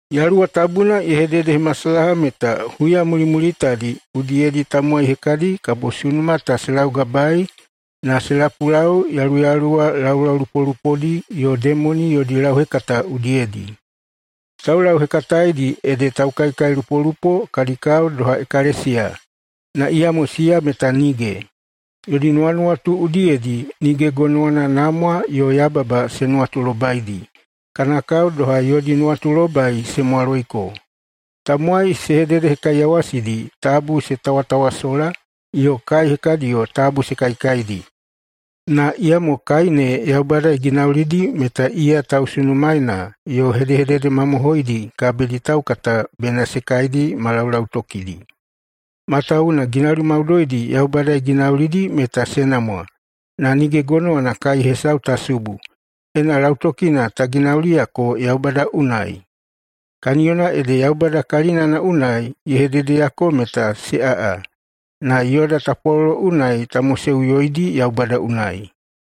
Yaluwa Tabuna ye hededehemasalaha meta huya mulimulitadi udiyedi tamowai hekadi kabo sunuma ta se laugabaei na se lapulau yaluyaluwa laulaulupolupodi yo demoni yodi lauhekata udiyedi. Taulauhekataeidi ede taukaikailupolupo kadi kao doha ekalesiya, na iyamo siya meta nige. Yodi nuwanuwatu udiyedi nige gonowana namwa yo yababa se nuwatulobaidi, kana kao doha yodi nuwatulobai se mwaloiko. Tamowai se hededehekaiyawasidi tabu se tawatawasola, yo kai hekadiyo tabu se kaikaidi. Na iyamo kai ne Yaubada ye ginaulidi meta iya tausunumaena yo hedehedede mamohoidi kabidi taukata bena se kaidi ma laulautokidi. Matawuwuna ginauli maudoidi Yaubada ye ginaulidi meta se namwa, na nige gonowana kai hesau ta subu, ena lautokina ta ginauliyako Yaubada unai. Kaniyona ede Yaubada kalinana unai ye hededeyako meta se aꞌa, na yoda tapwalolo unai ta moseꞌuyoidi Yaubada unai.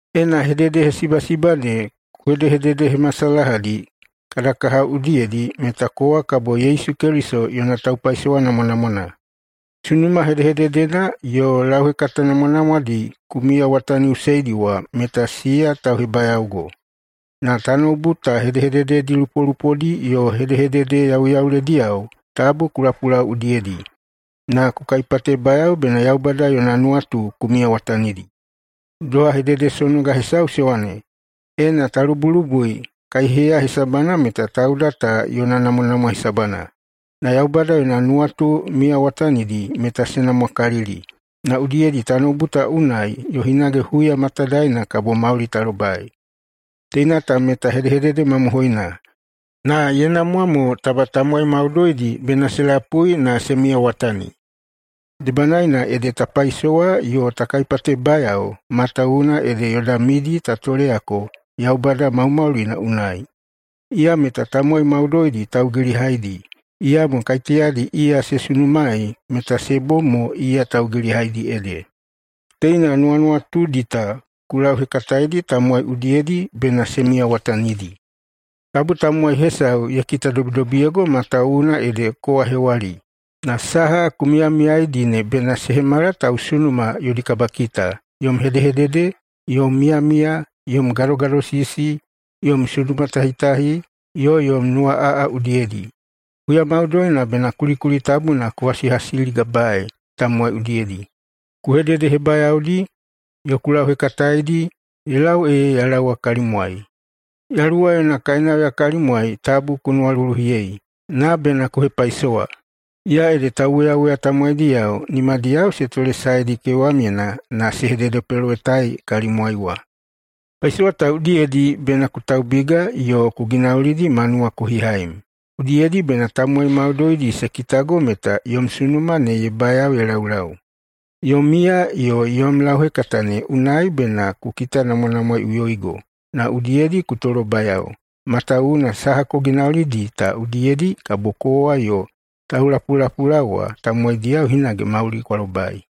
Ena hededehesibasiba ne ku hedehededehemasalahadi kada kahao udiyedi, meta kowa kabo Yesu Keliso yona taupaisowa namwanamwana. Sunuma hedehededena yo lauhekata namwanamwadi ku miyawataniꞌuseidi wa meta siya tauhebayaogo. Na tanoubu ta hedehedededi lupolupodi yo hedehedede yauyaulediyao tabu ku lapulau udiyedi, na ku kaipatebayao bena Yaubada yona nuwatu ku miyawatanidi. Doha hededesonoga hesau se wane, “Ena ta lubulubui kaiheya hesabana meta tauda ta yona namwanamwa hesabana, na Yaubada yona nuwatu miyawatanidi meta se namwakalikalili, na udiyedi tanoubu ta unai yo hinage huya matadaena kabo mauli ta lobai.” Teina ta meta hedehedede mamohoina, na ye namwa mo taba tamowai maudoidi bena se lapui na se miyawatani. Debanaena ede ta paisowa yo ta kaipatebayao, matawuwuna ede yoda midi ta toleyako Yaubada maumaulina unai. Iya meta tamowai maudoidi taugilihaidi, iyamo kaiteyadi iya se sunumaei meta se bom mo iya taugilihaidi ede. Teina nuwanuwatudi ta ku lauhekataedi tamowai udiyedi bena se miyawatanidi. Tabu tamowai hesau ye kitadobidobiyeigo matawuwuna ede kowa hewali, na saha ku miyamiyaidi ne bena se hemala tausunuma yodi kabakita, yom hedehedede, yom miyamiya, yom gadogadosisi, yom sunumatahitahi, yo yom nuwaꞌaꞌa udiyedi. Huya maudoina bena kulikuli tabuna ku hasihasiligabaei tamowai udiyedi, ku hededehebayaodi, yo ku lauhekataeidi, ye lau ee ya laowa kalimwai. Yaluwa yona kainauya kalimwai tabu ku nuwaluluhiyei, na bena ku hepaisowa. Iya ede tauwoyawoya tamowaidiyao nimadiyao se tolesaedi kewamyena na se hededepelowetaei kalimwai wa. Paisowa ta udiyedi bena ku taubiga yo ku ginaulidi ma nuwakohihaim. Udiyedi bena tamowai maudoidi se kitago meta yom sunuma ne ye bayao ye laulau. Yom miya yo yom lauhekata ne unai bena ku kitanamwanamwaeiꞌuyoigo na udiyedi ku tolobayao, matawuwuna saha ku ginaulidi ta udiyedi kabo kowa yo taulapulapulaowa tamowaidiyao hinage mauli kwa lobai.